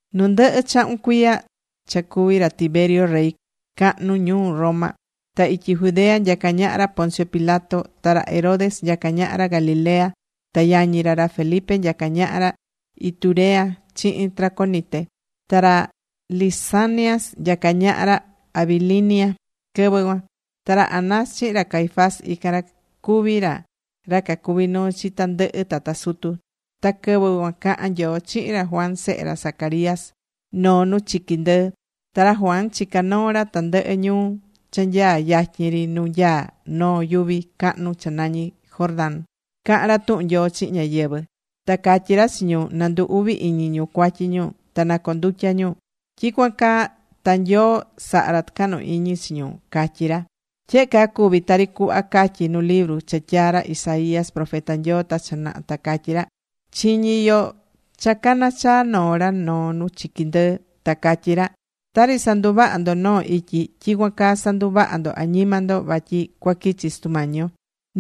Nu ndɨhɨ chahun cuiya cha cuví ra Tiberio rey cahnu ñuu Roma, ta ityi Judea nyacá ñaha ra Poncio Pilato. Ta ra Herodes nyacá ñaha ra Galilea. Ta yañi ra, ra Felipe nyacá ñaha ra Iturea chihin Traconite. Ta ra Lisanias nyacá ñaha ra Abilinia quɨvɨ cuan. Ta ra Anás chihin ra Caifás, ican ra cuví ra ra cacuví nuu chi tandɨhɨ tata sutu. Ta quɨvɨ cuan cahán Nyoo chihin ra Juan sehe ra Zacarías noo nu chiqui ndɨɨ. Ta ra Juan chicá noo ra tandɨhɨ ñuu cha nyaá yatyin ri nu nyaá noo yuvi cahnu cha nañí Jordán cahán ra tuhun Nyoo chihin ñáyɨvɨ. Ta catyí ra chi ñu na ndu uvi iñi ñu cuatyi ñu ta na condutya ñu. Tyicuan caa ta Nyoo saha ra tucahnu iñi chi ñu, catyí ra. Tyehe caa cuvi tari cuhva catyí nu libru cha tyaa̱ ra Isaías profeta Nyoo ta cha naha. Ta catyí ra: Chiñí yo cha caná chaa noo ra noo nu chiqui ndɨɨ, ta catyí ra: “Tari sanduvahá ndo noo ityi, tyicuan caa sa̱nduvaha ndo añima ndo vatyi cuaquichi Sutu Mañi yo.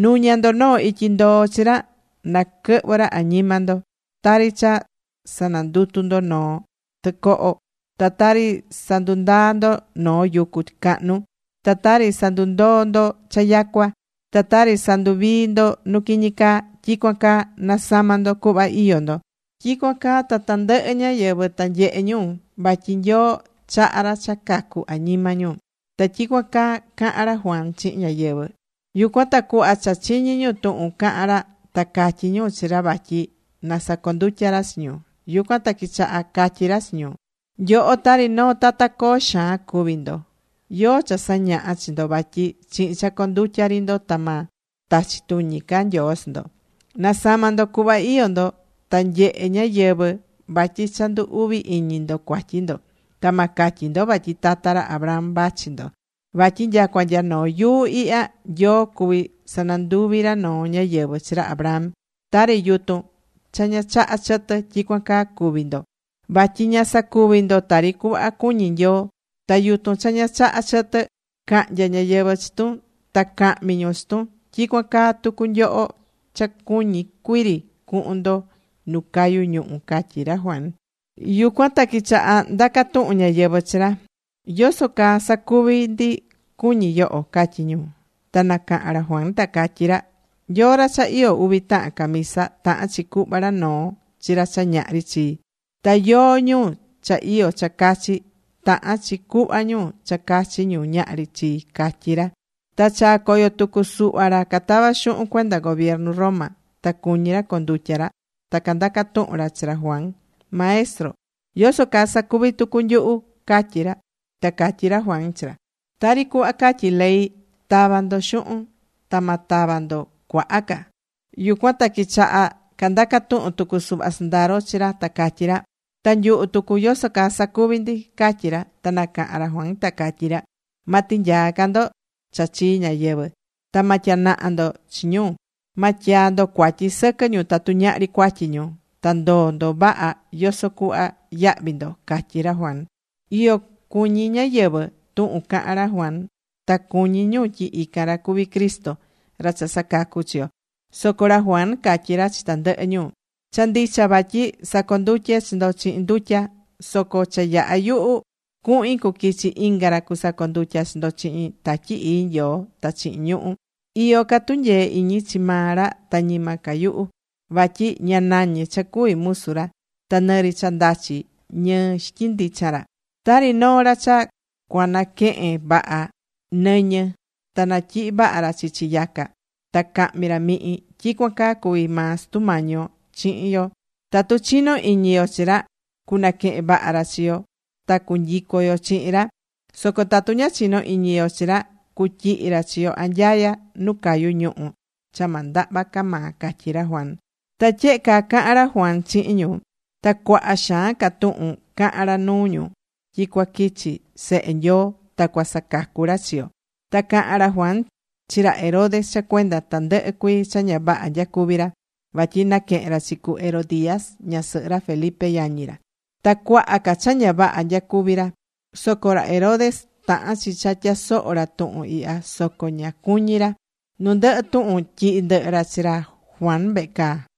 Nu̱ña ndo noo ityi ndoo chi ra na quɨhvɨ ra añima ndo. Tari cha sanandutú ndo noo tɨcoho, ta tari sandundaá ndo noo yucu cahnu, ta tari sandundoó ndo cha yacua, ta tari sanduvií ndo nu quiñi caa, tyicuan caa na̱sama ndo cuhva iyó ndo. Tyicuan caa ta tandɨhɨ ñáyɨvɨ ta nyehe ñu vatyi Nyoo chaha ra cha cacú añima ñu.” Ta tyicuan caa cahán ra Juan chihin ñáyɨvɨ. Yucuan ta cuhva cha chiñí ñu tuhun cahán ra, ta catyí ñu chi ra vatyi na sacondutya ra chi ñu. Yucuan ta quichaha catyi ra chi ñu: ―¡Nyoho tari noo tata coo xaan cuví ndo! ¿Yóó cha sañaha̱ chi ndo vatyi chihin cha condutya ri ndo ta ma tachi tuñi ca Nyoo chi ndo? Na̱sama ndo cuhva iyó ndo, na nyehe ñáyɨvɨ vatyi cha ndu uvi iñi ndo cuatyi ndo. Ta ma catyi ndo vatyi tata ra Abraham vachi ndo. Vatyi nyacua nya noo yuu ihya, Nyoo cuví sananduvi ra noo ñáyɨvɨ chi ra Abraham. Tari yutun cha ña chahá chɨtɨ, tyicuan caa cuvi ndo. Vatyi ña sacuví ndo tari cuhva cuñí Nyoo. Ta yutun cha ña chaha chɨtɨ, cahnya ñáyɨvɨ chi tun. Ta cahmi ñu chi tun. Tyicuan caa tucu nyoho cha cuñí cuiri cuhun ndo nu cayu ñuhu ―catyí ra Juan. Yucuan ta quichaha ndaca tuhun ñáyɨvɨ chi ra: ―¿Yoso caa sacuvi ndi, cuñí yoho? ―catyí ñu. Ta nacaha̱n ra Juan, ta catyí ra: ―Yóó ra cha iyó uvi tahan camisa, tahán chi cuhva ra noo chi ra cha ñahri chi. Ta yóó ñu cha iyó cha cachi, tahán chi cuhva ñu cha cachi ñu ñahri chi ―catyí ra. Ta chaa̱ coyo tucu suhva ra catavá xuhun cuenda gobiernu Roma, ta cuñí ra condutya ra. Ta candaca̱ tuhun ra chi ra Juan: ―Maestro, ¿yoso caa sacuvi tucu nyuhu? ―catyí ra. Ta catyí ra Juan chi ra: ―Tari cuhva catyí ley ta̱va ndo xuhun. Ta ma tava ndo cuaha ca. Yucuan ta quichaha candaca̱ tuhun tucu suhva sɨndaro chi ra, ta catyí ra: ―Ta nyuhu tucu, ¿yoso caa sacuvi ndi? ―catyí ra. Ta nacaha̱n ra Juan ta catyí ra: ―Ma tinyaa ca ndo cha chii ñáyɨvɨ. Ta ma tyanaha ndo chi ñu. Ma tyaa ndo cuatyi sɨquɨ ñu tatu ñahri cuatyi ñu. Ta ndo̱o ndo vaha yoso cuhva yahvi ndo ―catyí ra Juan. Iyo cuñí ñáyɨvɨ tuhun cahán ra Juan. Ta cuñí ñu tyi ican ra cuví Cristo, ra cha sacacú chi yo. Soco ra Juan catyí ra chi tandɨhɨ ñu: ―Cha ndicha vatyi sacondutyé chi ndo chihin ndutya. Soco cha yaha yuhu cuhin cuquichi inga ra cusacondutya chi ndo chihin Tatyi Ii Nyoo ta chihin ñuhu̱. Iyó ca tunyee iñi chi maa ra, ta ñima ca yuhu. Vatyi ña nañé cha cuví musu ra ta nɨri cha ndachi ñɨɨ xityin ndichan ra. Tari noo ra cha cuanaquehen vaha nɨñɨ, ta natyihi vaha ra chichi yaca. Ta cahmi ra mihin. Tyicuan caa cuví maa Sutu Mañi yo chihin yo. Tatu chinó iñi yo chi ra, cunaquehen vaha ra chi yo, ta cunyicu yo chihin ra. Soco tatu ña chinó iñi yo chi ra cutyihi ra chi yo anyaya nu cayu ñuhu̱ cha ma ndahva ca maa ―catyí ra Juan. Ta tyehe caa caha̱n ra Juan chihin ñu. Ta cuaha xaan ca tuhun cahan ra nuu ñu tyi cuaquichi Sehe Nyoo ta cua sacacu ra chi yo. Ta cahán ra Juan chi ra Herodes cha cuenda tandɨhɨ cuii cha ña vaha nyacuví ra. Vatyi naquehe̱n ra chi cu Herodías, ñasɨhɨ ra Felipe yañi ra. Ta cuaha ca cha ña vaha nyacuví ra. Soco ra Herodes tahán chi cha tyasoho̱ ra tuhun ihya soco ña cuñí ra. Nu ndɨhɨ tuhun tyihi̱ ndɨhɨ ra chi ra Juan vehe caa.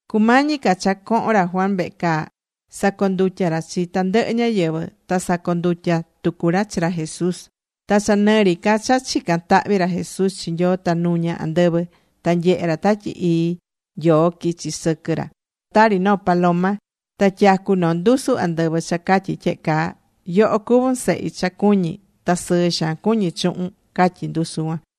Cumañi ca cha cohon ra Juan vehe caa sacondutya̱ ra chi tandɨhɨ ñáyɨvɨ. Ta sacondutya̱ tucu ra chi ra Jesús. Ta cha nɨ ri ca cha chicán tahvi ra Jesús chi Nyoo ta nuña̱ andɨvɨ. Ta nyehe̱ ra Tatyi Ii Nyoo quichi̱ sɨquɨ ra tari noo paloma. Ta tyacu̱ noo ndusu andɨvɨ cha catyí tyehe caa: ―Yoho cuvún Sehi cha cuñí. Ta sɨɨ xaan cuñí chuhun ―catyí ndusu cuan.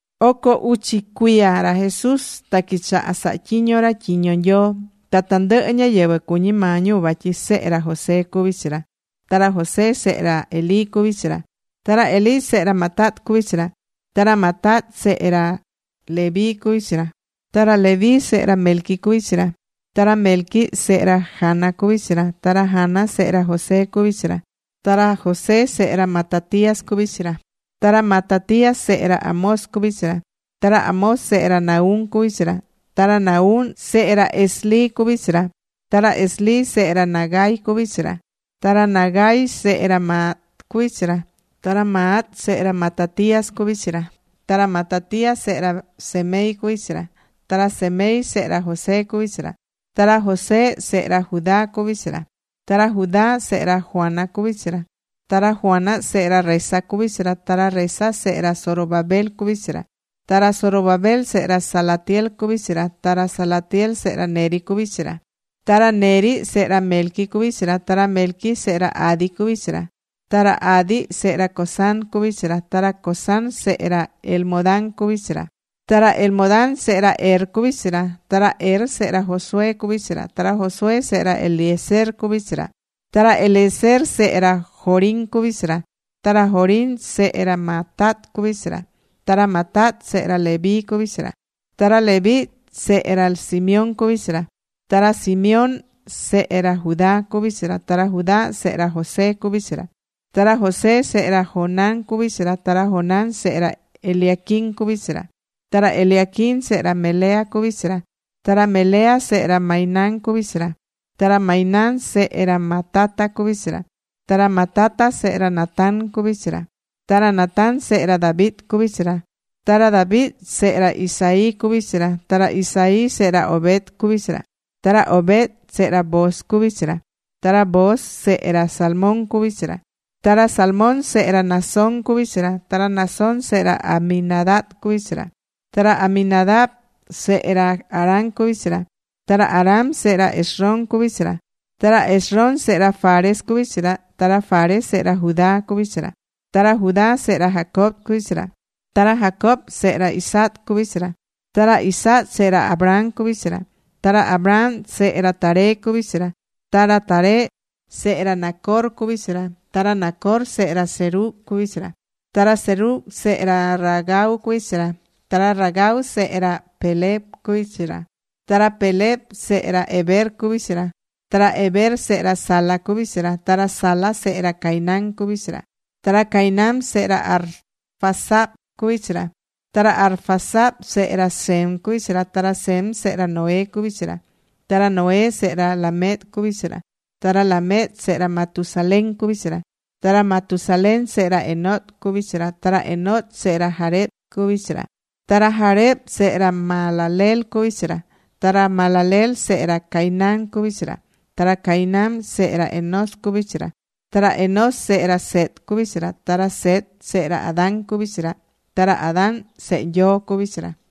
Oco uchi cuiya ra Jesús ta quichaha̱ saha tyiño ra tyiño Nyoo. Ta tandɨhɨ ñáyɨvɨ cuñí maa ñu vatyi sehe ra José cuví chi ra. Ta ra José, sehe ra Elí cuví chi ra. Ta ra Elí, sehe ra Matat cuví chi ra. Ta ra Matat, sehe ra Leví cuví chi ra. Ta ra Leví, sehe ra Melqui cuví chi ra. Ta ra Melqui, sehe ra Jana cuví chi ra. Ta ra Jana, sehe ra José cuví chi ra. Ta ra José, sehe ra Matatías cuví chi ra. Ta ra Matatías, sehe ra Amós cuví chi ra. Ta ra Amós sehe ra Nahum cuví chi ra. Ta ra Nahum, sehe ra Esli cuví chi ra. Ta ra Esli, sehe ra Nagai cuví chi ra. Ta ra Nagai, sehe ra Maat cuví chi ra. Ta ra Maat, sehe ra Matatías cuví chi ra. Ta ra Matatías sehe ra Semei cuví chi ra. Ta ra Semei, sehe ra José cuví chi ra. Ta ra José, sehe ra Judá cuví chi ra. Ta ra Judá, sehe ra Joana cuví chi ra. Ta ra Joana sehe ra Resa cuví chi ra. Ta ra Resa, sehe ra Zorobabel cuví chi ra. Ta ra Zorobabel, sehe ra Salatiel cuví chi ra. Ta ra Salatiel, sehe ra Neri cuví chi ra. Ta ra Neri, sehe ra Melqui cuví chi ra. Ta ra Melqui, sehe ra Adi cuví chi ra. Ta ra Adi, sehe ra Cosam cuví chi ra. Ta ra Cosam, sehe ra Elmodam cuví chi ra. Ta ra Elmodam, sehe ra Er cuví chi ra. Ta ra Er, sehe ra Josué, cuví chi ra. Ta ra Josué, sehe ra Eliezer cuví chi ra. Ta ra Eliezer, sehe ra Jorim cuví chi ra. Ta ra Jorim, sehe ra Matat cuví chi ra. Ta ra Matat, sehe ra Leví cuví chi ra. Ta ra Leví, sehe ra Simeón cuví chi ra. Ta ra Simeón, sehe ra Judá cuví chi ra. Ta ra Judá, sehe ra José cuví chi ra. Ta ra José sehe ra Jonán cuví chi ra. Ta ra Jonán, sehe ra Eliaquim cuví chi ra. Ta ra Eliaquim, sehe ra Melea, cuví chi ra. Ta ra Melea, sehe ra Mainán cuví chi ra. Ta ra Mainán, sehe ra Matata cuvi chi ra. Ta ra Matata, sehe ra Natán cuví chi ra. Ta ra Natán, sehe ra David, cuví chi ra. Ta ra David, sehe ra Isaí cuví chi ra. Ta ra Isaí, sehe ra Obed cuví chi ra. Ta ra Obed, sehe ra Booz cuví chi ra. Ta ra Booz, sehe ra Salmón cuví chi ra. Ta ra Salmón, sehe ra Naasón cuví chi ra. Ta ra Naasón, sehe ra Aminadab cuví chi ra. Ta ra Aminadab, sehe ra Aram cuví chi ra. Ta ra Aram, sehe ra Esrom cuví chi ra. Ta ra Esrom, sehe ra Fares cuví chi ra. Ta ra Fares, sehe ra Judá cuví chi ra. Ta ra Judá, sehe ra Jacob cuví chi ra. Ta ra Jacob, sehe ra Isaac cuví chi ra. Ta ra Isaac, sehe ra Abraham cuví chi ra. Ta ra Abraham sehe ra Taré cuví chi ra. Ta ra Taré, sehe ra Nacor cuví chi ra. Ta ra Nacor, sehe ra Serug cuví chi ra. Ta ra Serug, sehe ra Ragau cuví chi ra. Ta ra Ragau, sehe ra Peleg cuví chi ra. Ta ra Peleg, sehe ra Heber cuví chi ra. Ta ra Heber, sehe ra Sala cuví chi ra. Ta ra Sala, sehe ra Cainán cuví chi ra. Ta ra Cainán, sehe ra Arfaxad cuví chi ra. Ta ra Arfaxad, sehe ra Sem cuví chi ra. Ta ra Sem, sehe ra Noé cuví chi ra. Ta ra Noé, sehe ra Lamec cuví chi ra. Ta ra Lamec, sehe ra Matusalén cuví chi ra. Ta ra Matusalén sehe ra Enoc cuví chi ra. Ta ra Enoc, sehe ra Jared cuví chi ra. Ta ra Jared, sehe ra Mahalaleel cuví chi ra. Ta ra Mahalaleel, sehe ra Cainán cuví chi ra. Ta ra Cainán, sehe ra Enós cuví chi ra. Ta ra Enós, sehe ra Set cuví chi ra. Ta ra Set, sehe ra Adán cuví chi ra. Ta ra Adán, sehe Nyoo cuví chi ra.